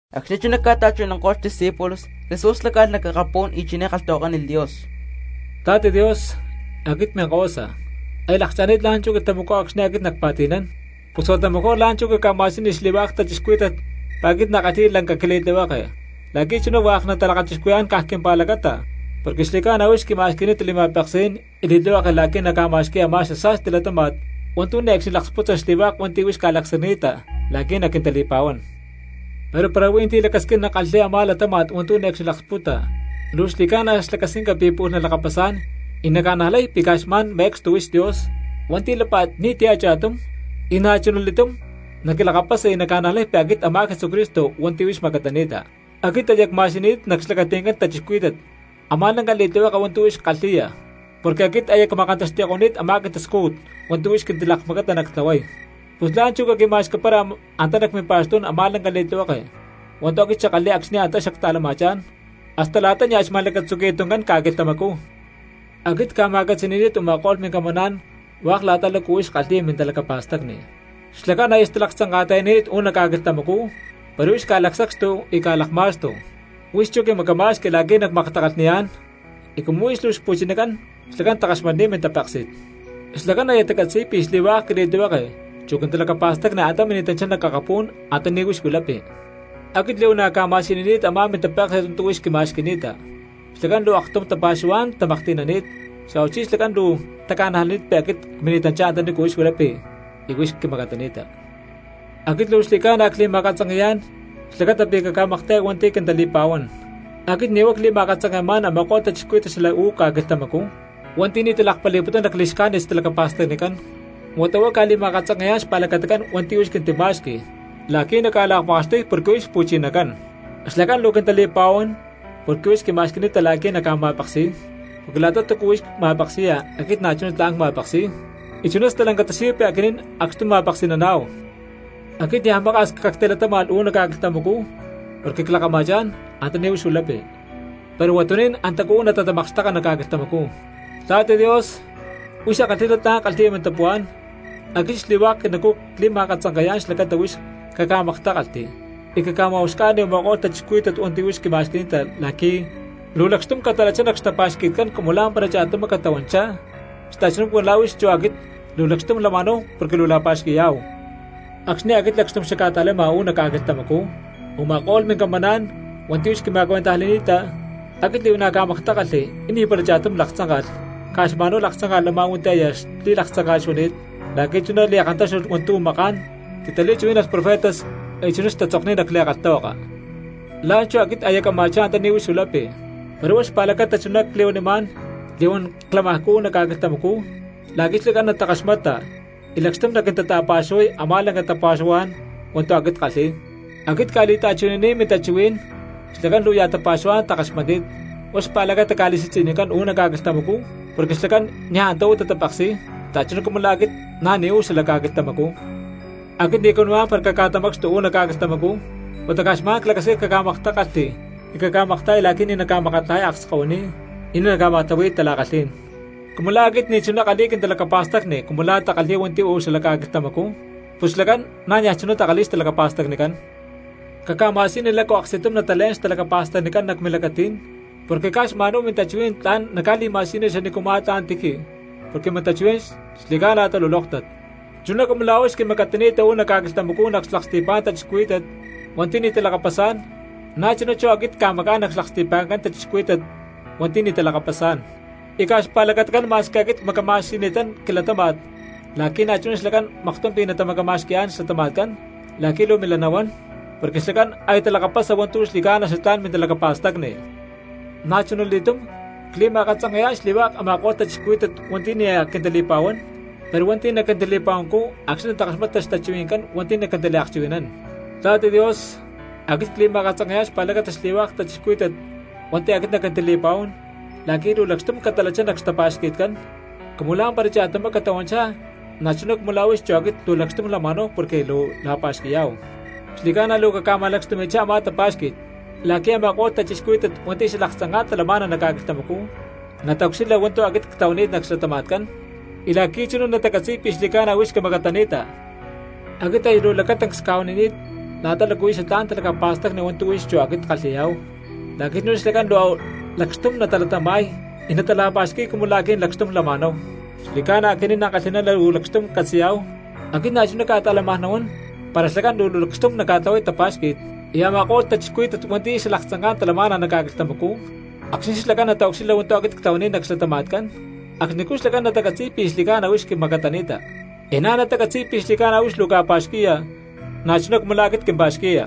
Acxni̠ chuná ca̠ta̠chuhui̠nanko̠lh xdiscípulos, Jesús láca̠lh nac akapú̠n y chiné kalhtahuakánilh Dios: —Papá Dios, aquit minkahuasa, aya lakcha̠ni̠t la̠nchú quilhtamacú acxni̠ aquit nacpa̠ti̠nán, pus huata mejor la̠nchú caca̠ma̠siyuni xli̠hua̠k cristianos pi̠ aquit na̠ ckalhi̠y lanca quili̠tlihueke, la̠qui̠ chuná hua̠k natalakachixcuhui̠yá̠n caj quimpa̠lacata. Porque xli̠ca̠na huix quima̠xqui̠ni̠ta li̠ma̠peksí̠n y li̠tlihueke la̠qui̠ nacca̠ma̠xqui̠y a̠má xasa̠sti latáma̠t hua̠ntu̠ ne̠cxni laksputa xli̠hua̠k hua̠nti̠ huix ca̠lacsacni̠ta la̠qui̠ naquintali̠pa̠huán. Pero para hui̠ntí lacasquín nakalhi̠y a̠má latáma̠t hua̠ntu̠ ne̠cxni laksputa luu xli̠ca̠na xlacasquinca pi̠ pu̠lh nalakapasá̠n y naca̠najlay pi̠ caj xma̠n me̠cstu huix Dios hua̠nti̠ lápa̠t ni̠ti̠ a̠cha̠tum, y na̠chuna li̠túm naquilakapasa y naca̠najlay pi̠ aquit a̠má Jesucristo hua̠nti̠ huix macatani̠ta. ’Aquit aya cma̠siyuni̠t nac xlacati̠ncán cristianos a̠má lanca li̠tlihueke hua̠ntu̠ huix kalhi̠ya porque aquit aya cma̠kantaxti̠ko̠ni̠t a̠má quintascújut hua̠ntu̠ huix quintilakmacata nactlahuay. Pus la̠nchú caquima̠xqui̠para antá nac mimpa̠xtú̠n a̠má lanca li̠tlihueke hua̠ntu̠ aquit xackalhi̠y acxni̠ antá xacta̠lama̠chá̠n hasta la̠ta nia̠ xma̠lacatzuqui̠yá̠hu tuncán ca̠quilhtamacú. ’Aquit cca̠ma̠catzi̠ni̠ni̠t u̠ma̠ko̠lh mincamaná̠n hua̠k la̠ta lácu huix kalhi̠ya mintalacapa̠stacni; xlacán aya xtalaktzanka̠ta̠yani̠t uú nac ca̠quilhtamacú pero huix ca̠lacsacxtu y ca̠lakma̠xtu, huix chú quimacama̠xqui la̠qui̠ nacmaktakalhniyá̠n, y cumu huix luu xpu̠chinacán xlacán takalhakaxmatni̠t mintapéksi̠t. Xlacán aya tacatzi̠y pi̠ xli̠hua̠k quili̠tlihueke chu quintalacapa̠stacni antá mini̠tanchá nac akapú̠n antaní huix huilapi. Aquit li̠huana̠ cca̠ma̠siyunini̠t a̠má mintapéksi̠t hua̠ntu̠ huix quima̠xqui̠ni̠ta, xlacán luu aktum tapa̠xuhuá̠n tamaklhti̠nani̠t, xa̠huachí xlacán luu taca̠najlani̠t pi̠ aquit cmini̠tanchá antaní huix huilapi y huix quimacatani̠ta. ’Aquit luu xli̠ca̠na cli̠ma̠katzanke̠yá̠n xlacata pí̠ caca̠makta̠ya hua̠nti̠ quintali̠pa̠huán; aquit ni̠ huá cli̠ma̠katzanke̠má̠n a̠ma̠ko̠lh cristianos xala uú ca̠quilhtamacú hua̠nti̠ ni̠ talakpali̠putún lacli̠xcájnit xtalacapa̠stacnicán, huata huá cca̠li̠ma̠katzanke̠yá̠n xpa̠lacatacán hua̠nti̠ huix quintima̠xqui la̠qui̠ nacca̠lakma̠xtuy porque huix xpu̠chinacán. Xlacán luu quintali̠pa̠huán porque huix quima̠xqui̠ni̠ta la̠qui̠ nacca̠ma̠peksi̠y, porque la̠ta túcu huix ma̠peksi̠ya aquit na̠chuná tla̠n cma̠peksi̠y, y chuná stalanca tasiyuy pi̠ aquinín acxtum ma̠peksi̠naná̠hu. ’Aquit niaj maka̠s cactilatáma̠lh uú nac ca̠quilhtamacú porque clakama̠chá̠n antaní huix huilapi, pero huatuní̠n antacú uú natatamakxteka nac ca̠quilhtamacú. Papá Dios huix ankalhi̠ná tla̠n kalhi̠ya mintapuhuá̠n, aquit xli̠hua̠k quinacú cli̠ma̠katzanke̠yá̠n xlacata huix caca̠maktákalhti y caca̠ma̠uxca̠ni u̠ma̠ko̠lh cristianos hua̠nti̠ huix quima̠xqui̠ni̠ta la̠qui̠ luu lakxtum catalachá nac xtapa̠xqui̠tcán cumu lá̠mpara cha̠tumá catahuanchá xta̠chuná cumu la̠ huix chu aquit luu lakxtum lama̠náhu porque luu la̠pa̠xqui̠yá̠hu. Acxni̠ aquit lacxtum xacca̠ta̠lama uú nac ca̠quilhtamacú u̠ma̠ko̠lh mincamaná̠n hua̠nti̠ huix quima̠cuentajli̠ni̠ta, aquit li̠huana̠ cca̠maktákalhli y ni̠para cha̠tum laktzánka̠lh, caj xma̠nhuá laktzánka̠lh a̠má hua̠nti̠ aya xli̠laktzánka̠t xuani̠t la̠qui̠ chuná li̠kantáxtulh hua̠ntu̠ maká̠n titali̠chuhuí̠nalh profetas y chuná tatzokni̠t nac li̠kalhtahuaka. ’La̠nchú aquit aya cama̠chá antaní huix huilapi, pero huá xpa̠lacata chuná cli̠huanimá̠n li̠huán clamajcú uú nac ca̠quilhtamacú la̠qui̠ xlacán natakaxmata y lacxtum naquintata̠pa̠xuhuay a̠má lanca tapa̠xuhuá̠n hua̠ntu̠ aquit ckalhi̠y. Aquit cca̠li̠ta̠chuhui̠nani̠t mintachuhuí̠n, xlacán luu ya̠ tapa̠xuhuá̠n takaxmatni̠t, huá xpa̠lacata ca̠li̠si̠tzi̠nicán uú nac ca̠quilhtamacú porque xlacán niaj antá uú tatapeksi̠y xta̠chuná cumu la̠ aquit na̠ ni̠ uú xalac ca̠quilhtamacú. Aquit ni̠ cuanimá̠n para caca̠tamacxtu uu̠ nac ca̠quilhtamacú, huata caj xma̠n clacasquín caca̠maktákalhti y caca̠makta̠ya la̠qui̠ ni̠ naca̠makatlajay akskahuiní y ni̠ naca̠ma̠tlahui̠y tala̠kalhí̠n. Cumu la̠ aquit ni̠chuná ckalhi̠y quintalacapa̠stacni cumu la̠ takalhi̠y hua̠nti̠ uú xala ca̠quilhtamacú, pus xlacán na̠ niaj chuná takalhi̠y xtalacapa̠stacnicán. Caca̠ma̠siyuni lácu aksti̠tum natalé̠n xtalacapa̠stacnicán nac milacatí̠n, porque caj xma̠nhuá mintachuhuí̠n tla̠n naca̠li̠ma̠siyuniya xanícuma̠ tla̠n tiji porque mintachuhuí̠n xli̠ca̠na talulóktat. Chuná cumu la̠ huix quimacatani̠ta uú nac ca̠quilhtamacú nac xlaksti̠pá̠n cristianos hua̠nti̠ ni̠ talakapasá̠n, na̠chuná chú aquit cca̠macá̠n nac xlaksti̠pa̠ncán a̠ma̠ko̠lh cristianos hua̠nti̠ ni̠ talakapasá̠n. Y caj xpa̠lacatacán ma̠squi aquit cmacama̠xqui̠ni̠tán quilatáma̠t la̠qui̠ na̠chuná xlacán maktum pi̠ natamacama̠xqui̠yá̠n xlatama̠tcán la̠qui̠ luu milá nahuán, porque xlacán aya talakapasa hua̠ntu̠ xli̠ca̠na xatlá̠n mintalacapa̠stacni. ’Na̠chunali̠túm cli̠ma̠katzanke̠yá̠n xli̠hua̠k a̠ma̠ko̠lh cristianos hua̠nti̠ ni̠ naj quintali̠pa̠huán, pero hua̠nti̠ naquintali̠pa̠huancú acxni̠ natakaxmata xtachuhui̠ncán hua̠nti̠ naquintaliakchuhui̠nán. Papá Dios, aquit cli̠ma̠katzanke̠yá̠n xpa̠lacata xli̠hua̠k cristianos hua̠nti̠ aquit naquintali̠pa̠huán la̠qui̠ luu lakxtum catalachá nac xtapa̠xqui̠tcán, cumu lá̠mpara cha̠tumá catahuanchá na̠chuná cumu la̠ huix chu aquit luu lakxtum lama̠náhu porque luu la̠pa̠xqui̠yá̠hu. Xli̠ca̠na luu caca̠ma̠lakxtumi̠chá a̠má tapa̠xqui̠t, la̠qui̠ a̠ma̠ko̠lh cristianos hua̠nti̠ xalaktzanká̠n talamá̠na nac ca̠quilhtamacú nataucxilha hua̠ntu̠ aquit ctlahuani̠t nac xlatama̠tcán, y la̠qui̠ chuná natacatzi̠y pi̠ xli̠ca̠na huix quimacatani̠ta. Aquit aya luu lacatancs cca̠huanini̠t la̠ta lácu huí xatlá̠n talacapa̠stacni hua̠ntu̠ huix chú aquit kalhi̠yá̠hu, la̠qui̠ chuná xlacán luu lakxtum natalatama̠y y natala̠pa̠xqui̠y cumu la̠ aquinín lakxtum lama̠náhu. Xli̠cána aquinín ankalhi̠ná luu lacxtum catzi̠yá̠hu, aquit na̠chuná cca̠ta̠lamaj nahuán para xlacán luu lakxtum naca̠tlahuay tapa̠xqui̠t, y a̠ma̠ko̠lh cristianos hua̠nti̠ xalaktzanká̠n talama̠na nac ca̠quilhtamacú, acxni̠ xlacán nataucxilha hua̠ntu̠ aquit ctlahuani̠t nac xlatama̠tcán acxnicú xlacán natacatzi̠y pi̠ xli̠ca̠na huix quimacatani̠ta, y na̠ natacatzi̠y pí̠ xli̠ca̠na huix luu ca̠pa̠xqui̠ya na̠chuná cumu la̠ aquit quimpa̠xqui̠ya.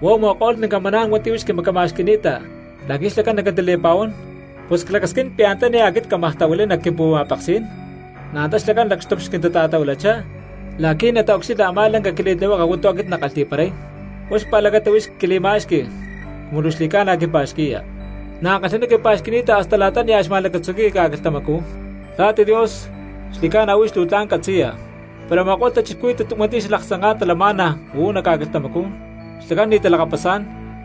’Huá u̠ma̠ko̠lh mincamaná̠n hua̠nti̠ huix quimacama̠xqui̠ni̠ta la̠qui̠ xlacán naquintali̠pa̠huán, pus aquit clacasquín pi̠ antaní aquit cámaj tahuilay nac quimpu̠ma̠peksí̠n, na̠ antá xlacán lacxtum xquintata̠tahuilachá la̠qui̠ nataucxilha a̠má lanca quili̠tlihueke hua̠ntu̠ aquit nackalhi̠paray; huá xpa̠lacata huix quili̠ma̠xqui cumu luu xli̠ca̠na quimpa̠xqui̠ya, na̠ ankalhi̠ná quimpa̠xqui̠ni̠ta hasta la̠ta nia̠ xma̠lacatzuqui̠yá̠hu ca̠quilhtamacú. Papá, xli̠ca̠na huix luu tla̠n catzi̠ya, pero a̠ma̠ko̠lh cristianos hua̠nti̠ xalaktzanká̠n talamá̠na uú nac ca̠quilhtamacú xlacán ni̠ talakapasá̠n,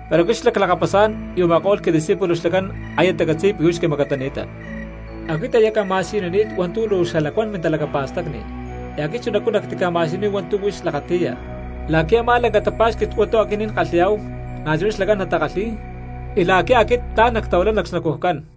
pero aquit xlá clakapasá̠n y u̠ma̠ko̠lh quidiscípulos xlacán aya tacatzi̠y pi̠ huix quimacatani̠ta. Aquit aya cca̠ma̠siyunini̠t hua̠ntu̠ luu xalacuán mintalacapa̠stacni, y aquit chunacú nactica̠ma̠siyuniy hua̠ntu̠ huix lakati̠ya, la̠qui̠ a̠má lanca tapa̠xqui̠t hua̠ntu̠ aquinín kalhi̠yá̠hu na̠chuná xlacán natakalhi̠y, y la̠qui̠ aquit tla̠n nactahuilay nac xnacujcán.